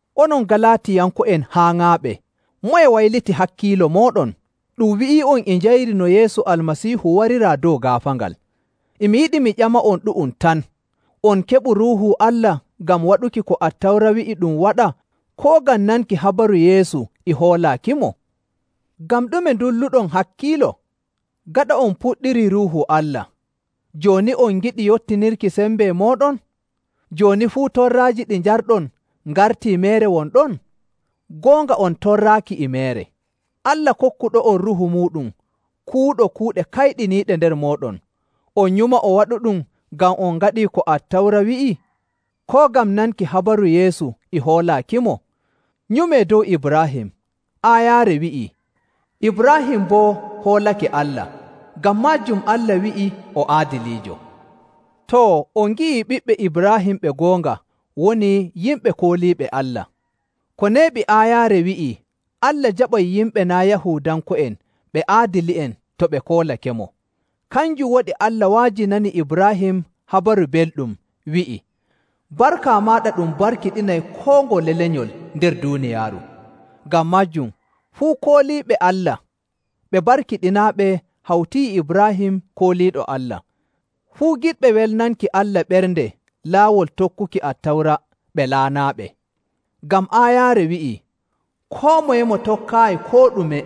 Onon Galaatiyanko'en haaŋaaɓe! Moye wayliti hakkiilo mooɗon? Ɗum wi'ii'on e njayri no Yeesu Almasiihu wariraa dow gaafaangal. E mi yiɗi mi ƴama'on ɗu'um tan: On keɓu Ruuhu Allah ngam waɗuki ko Attawra wi'i ɗum waɗa, koo ngam nanki habaru Yeesu e hoolaakimo? Ngam ɗume ndulluɗon hakkiilo? Gaɗa on puɗɗirii Ruuhu Allah, jooni on ngiɗi yottinirki sembe mooɗon? Jooni fuu torraaji ɗi njarɗon ngartii meere won ɗon? Goonga on torraaki e meere. Allah kokkuɗo'on Ruuhu muuɗum kuwuɗo kuuɗe kayɗiniiɗe nder mooɗon, on nyuma o waɗuɗum ngam on ngaɗii ko Attawra wi'i, koo ngam nanki habaru Yeesu e hoolaakimo? Nyumee dow Ibraahim. Aayaare wi'ii, “Ibraahim boo hoolake Allah, ngam maajum Allah wi'i o aadiliijo.” Too, on ngi'ii ɓiɓɓe Ibraahim ɓe goonga woni yimɓe kooliiɓe Allah. Ko neeɓi aayaare wi'ii Allah jaɓay yimɓe naa' Yahuudanko'en ɓe aadili'en to ɓe koolakemo. Kanjum waɗi Allah wa'ajinani Ibraahim Habaru Belɗum wi'i, “Barka maaɗa ɗum barkiɗinay koo ngole lenyol nder duuniyaaru.” Ngam maajum fuu kooliiɓe Allah ɓe barkiɗinaaɓe hawti e Ibraahim kooliiɗo Allah. Fuu giɗɓe welnanki Allah ɓernde laawol tokkuki Attawra ɓe laanaaɓe. Ngam aayaare wi'ii, “Koo moye mo tokkaayi koo ɗume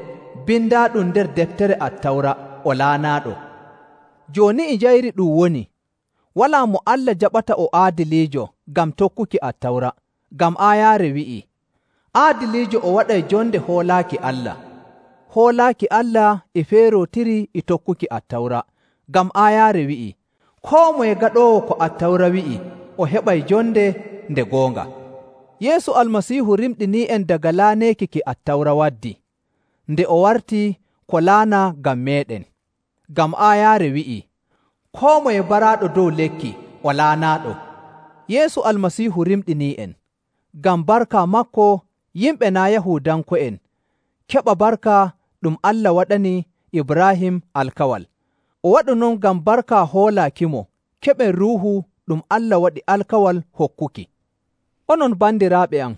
bindaaɗum nder deftere Attawra o laanaaɗo.” Jooni e njayri ɗum woni, walaa mo Allah jaɓata o aadiliijo ngam tokkuki Attawra, ngam aayaare wi'ii, “Aadiliijo o waɗay jonde hoolaaki Allah.” Hoolaaki Allah e feerootiri e tokkuki Attawra. Ngam aayaare wi'ii, “Koo moye gaɗoowo ko Attawra wi'i o heɓay jonde nde goonga.” Yeesu Almasiihu rimɗinii'en daga laaneeki ki Attawra waddi, nde o warti ko laanaa ngam meeɗen. Ngam aayaare wi'ii, “Koo moye baraaɗo dow lekki o laanaaɗo.” Yeesu Almasiihu rimɗinii'en, ngam barka maako yimɓe naa' Yahuudanko'en keɓa barka ɗum Allah waɗani Ibraahim alkawal. O waɗu non ngam barka hoolaakimo keɓen Ruuhu ɗum Allah waɗi alkawal hokkuki. Onon bandiraaɓe am,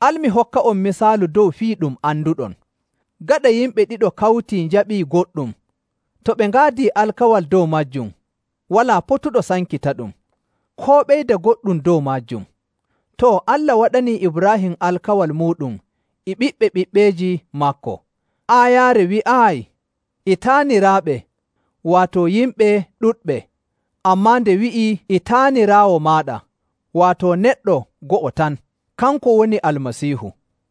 al mi hokka'on misaalu dow fii ɗum anduɗon. Gaɗa yimɓe ɗiɗo kawtii njaɓii goɗɗum, to ɓe ngaadii alkawal dow maajum, walaa potuɗo sankitaɗum, koo ɓeyda goɗɗum dow maajum. Too, Allah waɗanii Ibraahim alkawal muuɗum e ɓiɓɓe ɓiɓɓeeji maako. Aayaare wi'aayi, “e taaniraaɓe,” waato yimɓe ɗuɗɓe, ammaa nde wi'i, “e taaniraawo maaɗa,” waato neɗɗo go'o tan, kanko woni Almasiihu.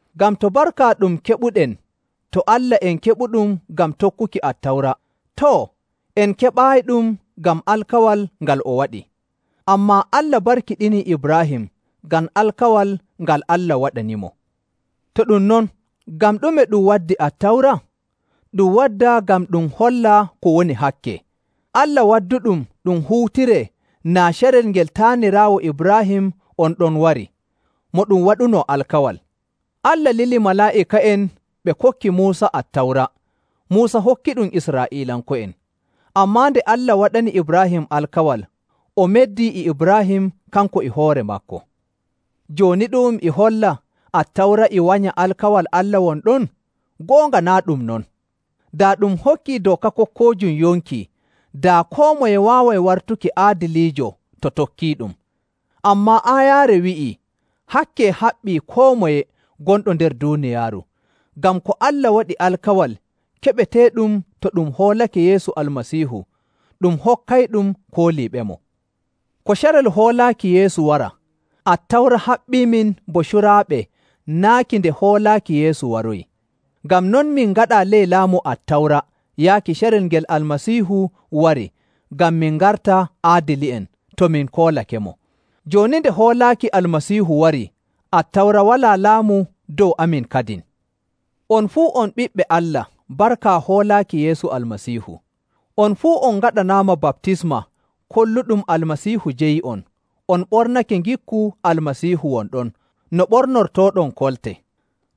Ngam to barka ɗum keɓuɗen to Allah en keɓuɗum ngam tokkuki Attawra, too, en keɓaayiɗum ngam alkawal ngal o waɗi. Ammaa Allah barkiɗinii Ibraahim ngam alkawal ngal Allah waɗanimo. To ɗum non, ngam ɗume ɗum waddi Attawra? Ɗum wadda ngam ɗum holla ko woni hakke. Allah wadduɗum ɗum huutiree naa carel ngel taaniraawo Ibraahim on ɗon warii, mo ɗum waɗuno alkawal. Allah lili malaa'ika'en ɓe kokki Muusa Attawra, Muusa hokkiɗum Israa'iilanko'en. Ammaa nde Allah waɗani Ibraahim alkawal, o meddi e Ibraahim kanko e hoore maako. Jooni ɗu'um e holla Attawra e wanya alkawal Allah won ɗon? Goonga naa' ɗum non. Daa ɗum hokkii dooka kokkoojum yonki, daa koo moye waaway wartuki aadiliijo to tokkiiɗum. Ammaa aayaare wi'ii hakke haɓɓii koo moye gonɗo nder duuniyaaru, ngam ko Allah waɗi alkawal keɓeteeɗum to ɗum hoolake Yeesu Almasiihu, ɗum hokkayɗum kooliiɓemo. Ko carel hoolaaki Yeesu wara, Attawra haɓɓiimin bo curaaɓe naaki nde hoolaaki Yeesu waroyi. Ngam non, min ngaɗaa ley laamu Attawra yaaki carel ngel Almasiihu wari ngam min ngarta aadili'en, to min koolakemo. Jooni nde hoolaaki Almasiihu warii, Attawra walaa laamu dow amin kadin. On fuu on ɓiɓɓe Allah barka hoolaaki Yeesu Almasiihu. On fuu on ngaɗanaama baptisma kolluɗum Almasiihu jeyi'on on ɓornake ngikku Almasiihu won ɗon no ɓornortooɗon kolte.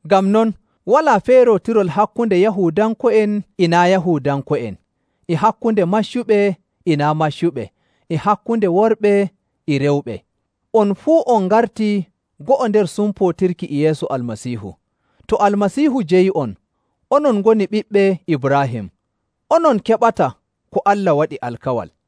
Ngam non walaa feerootirol hakkunde Yahuudanko'en e naa' Yahuudanko'en, e hakkunde maccuɓe e naa' maccuɓe, e hakkunde worɓe e rewɓe. On fuu on ngartii go'o nder sumpootirki e Yeesu Almasiihu. To Almasiihu jeyi'on, onon ngoni ɓiɓɓe Ibraahim, onon keɓata ko Allah waɗi alkawal.